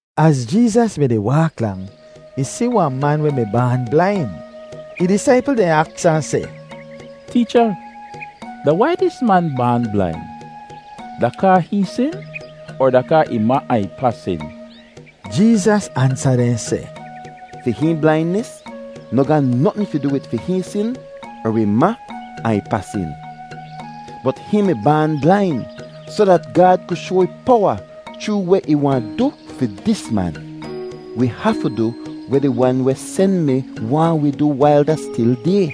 Az Jeezas mi-di waak lang, ih si wahn man weh mi baan blain. Ih disaipl dehn aks ahn seh, “Teecha, da wai dis man baan blain? Da kaa hihn sin, er da kaa ih ma ahn ih pa sin?” Jeezas ansa dehn seh, “Fi hihn blainis noh ga notn fi du wid fi hihn sin er ih ma ahn ih pa sin. Bot hihn mi baan blain soh dat Gaad ku shoa ih powa chroo weh ih wahn du fi dis man. Wi hafu du weh di Wan weh sen mi waahn wi du wail da stil day.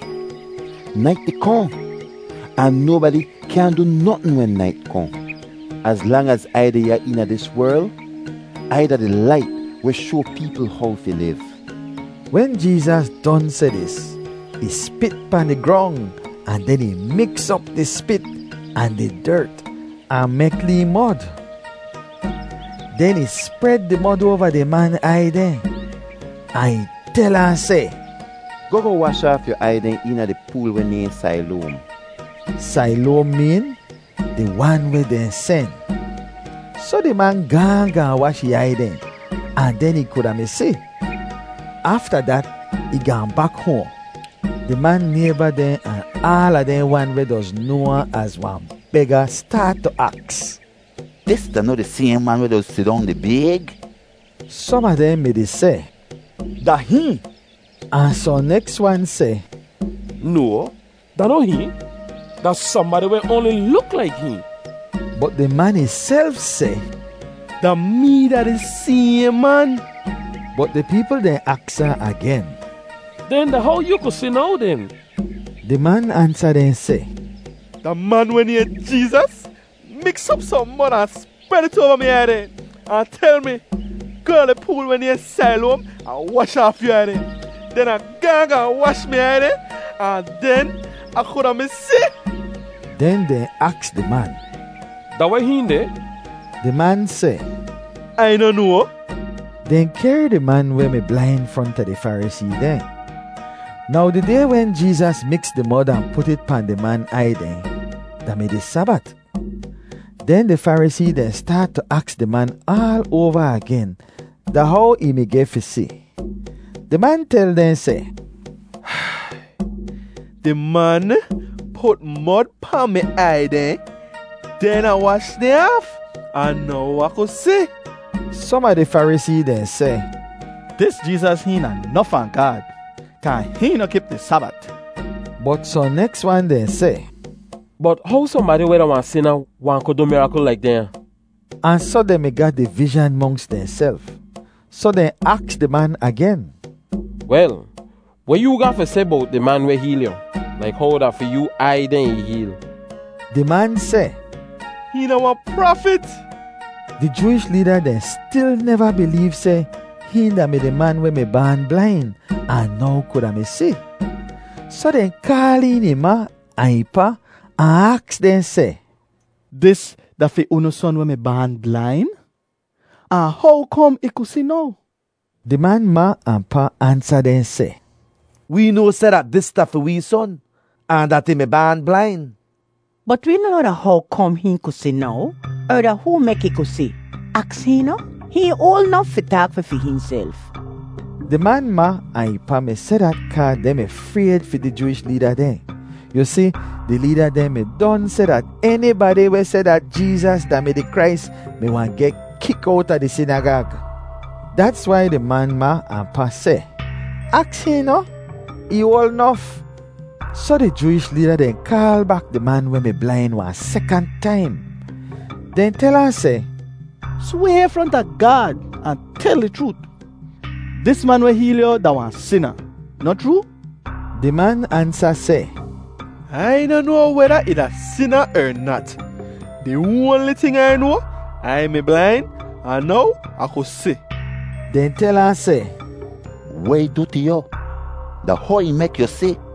Nait di kohn, ahn nobadi kyaahn du notn wen nait kohn. Az lang az Ai deh ya eena dis werl, Ai da di Lait weh shoa peepl how fi liv.” Wen Jeezas don seh dis, ih spit pahn di grong ahn den ih miks op di spit ahn di dert ahn mek lee mod. Den ih spred di mod oava di man aiy dehn, ahn ih tel ahn seh, “Goh goh wash aaf yu aiy dehn eena di pool weh nayhn Sailoam.” (Sailoam meen “di Wan weh dehn sen.”) Soh di man gaahn gaahn wash ih aiy dehn, ahn den ih kuda mi si. Afta dat, ih gaahn bak hoahn. Di man nayba dehn ahn aala dehn wan weh doz noa ahn az wahn bega staat tu aks, “Dis da noh di sayhn man weh doz sidong di bayg?” Som a dehn mi-di seh, “Da hihn.” Ahn sohn neks wan seh, “No, da noh hihn, da sohnbadi weh oanli luk laik hihn.” Bot di man ihself seh, “Da mee da di sayhn man.” Bot di peepl dehn aks ahn agen, “Den da how yoo ku si now den?” Di man ansa dehn seh, “Da man weh nayhn Jeezas miks op sohn mod ahn spred it oava mi aiy dehn ahn tel mi, ‘Goh da di pool weh nayhn Sailoam ahn wash aaf yu aiy dehn.’ Den Ah gaahn gaahn wash mi aiy dehn ahn den Ah kuda mi si.” Den dehn aks di man, “Da weh hihn deh?” Di man seh, “Ai noh noa.” Dehn kehr di man weh mi blain fronta di Farisee dehn. Now di day wen Jeezas miks di mod ahn put it pahn di man aiy dehn da-mi di Sabat. Den di Farisee dehn staat tu aks di man aal oava agen da how ih mi geh fi si. Di man tel dehn seh, “Di man put mod pahn mi aiy dehn. Den Ah wash dehn aaf, ahn now Ah ku si.” Som a di Farisee dehn seh, “Dis Jeezas hihn da noh fahn Gaad kaa hihn noh kip di Sabat.” Bot sohn neks wan dehn seh, “Bot how sohnbadi weh da wahn sina wahn ku du mirakl laik dehnya?” Ahn soh dehn mi ga divizhan monks dehnself. Soh dehn aks di man agen, “Wel, weh yoo ga fi seh bowt di man weh heel yu, laik how da fi yoo aiy dehn ih heel?” Di man seh, “Hihn da wahn prafit.” Di Jooish leeda dehn stil neva bileev seh hihn da-mi di man weh mi baan blain ahn now kuda mi si, soh dehn kaal een ih ma ahn ih pa ahn aks dehn seh, “Dis da fi unu son weh mi baan blain? Ahn how kom ih ku si now?” Di man ma ahn pa ansa dehn seh, “Wee noa seh dat dis da fi wee son, ahn dat ih mi baan blain. Bot wee noh noa da how kom hihn ku si now, er da hoo mek ih ku si. Aks hihn noh? Hihn oal nof fi taak fi fi hihnself.” Di man ma ahn ih pa mi seh dat kaa dehn mi frayd fi di Jooish leeda dehn. Yu si, di leeda dehn mi don seh dat enibadi weh seh dat Jeezas da-mi di Krais mi wahn geh kik owta di sinagag. Dats wai di man ma ahn pa seh, “Aks hihn noh? Ih oal nof.” Soh di Jooish leeda dehn kaal bak di man weh mi blain wahn sekant taim. Dehn tel ahn seh, “Sway fronta Gaad ahn tel di chroot. Dis man weh heel yu da wahn sina, noh chroo?” Di man ansa seh, “Ai noh noa weda ih da sina er nat! Di oanli ting Ai noa, Ai mi blain, ahn now Ah ku si.” Dehn tel ahn seh, “Weh ih du tu yu? Da how ih mek yu si?”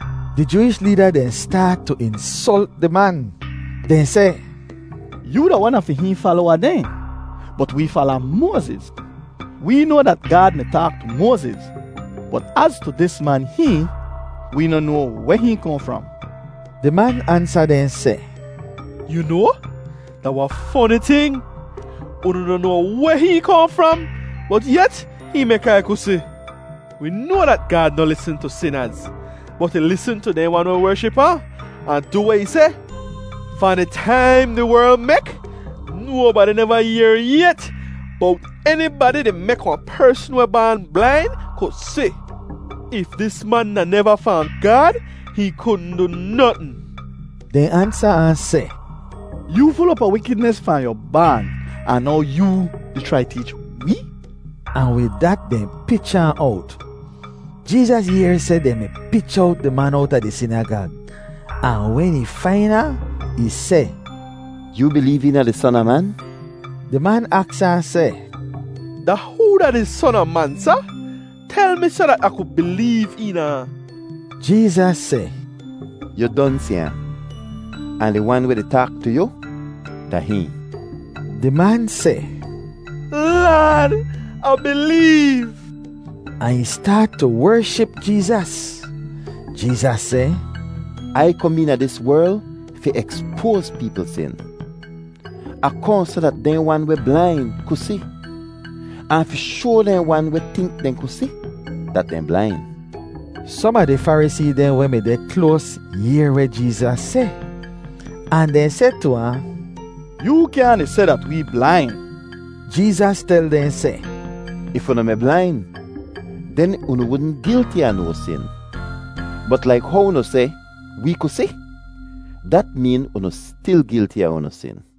Di Jooish leeda dehn staat tu insolt di man. Dehn seh, “Yoo da wan a fi hihn falowa dehn, bot wee fala Moaziz. Wee noa dat Gaad mi taak tu Moaziz, bot az tu dis man hihn, wee noh noa weh hihn kohn fram.” Di man ansa dehn seh, “Yu noa, da wahn foni ting! Unu noh noa weh hihn kohn fram, bot yet hihn mek Ai ku si. Wi noa dat Gaad noh lisn tu sinaz, bot ih lisn tu dehn wan weh wership ahn, ahn du weh ih seh. Fahn di taim di werl mek, nobadi neva yehr yet bowt enibadi di mek wahn persn weh baan blain ku si. If dis man da neva fahn Gaad, hihn kudn du notn.” Dehn ansa ahn seh, “Yoo ful op a wikidnis fahn yu baan, ahn now yoo di chrai teech wee?” Ahn wid dat dehn pich ahn owt. Jeezas yehr seh dehn mi pich owt di man owta di sinagag, ahn wen ih fain ahn, ih seh, “Yoo bileev eena di Son a Man?” Di man aks ahn seh, “Da hoo da di Son a Man, Sa? Tel mi soh dat Ah ku bileev eena ahn.” Jeezas seh, “Yu don si ahn, ahn di Wan weh di taak tu yu, da hihn.” Di man seh, “Laad, Ah bileev.” Ahn ih staat tu wership Jeezas. Jeezas seh, “Ai kom eena dis werl fi ekspoaz peepl sin. Ah kohn soh dat dehn wan weh blain ku si, ahn fi shoa dehn wan weh tink dehn ku si, dat dehn blain.” Som a di Farisee dehn weh mi deh kloas yehr weh Jeezas seh, ahn dehn seh tu ahn, “Yoo kyaahn di seh dat wee blain.” Jeezas tel dehn seh, “If unu mi blain, den unu wudn gilti a no sin. Bot laik how unu seh, ‘Wee ku si,’ dat meen unu stil gilti a unu sin.”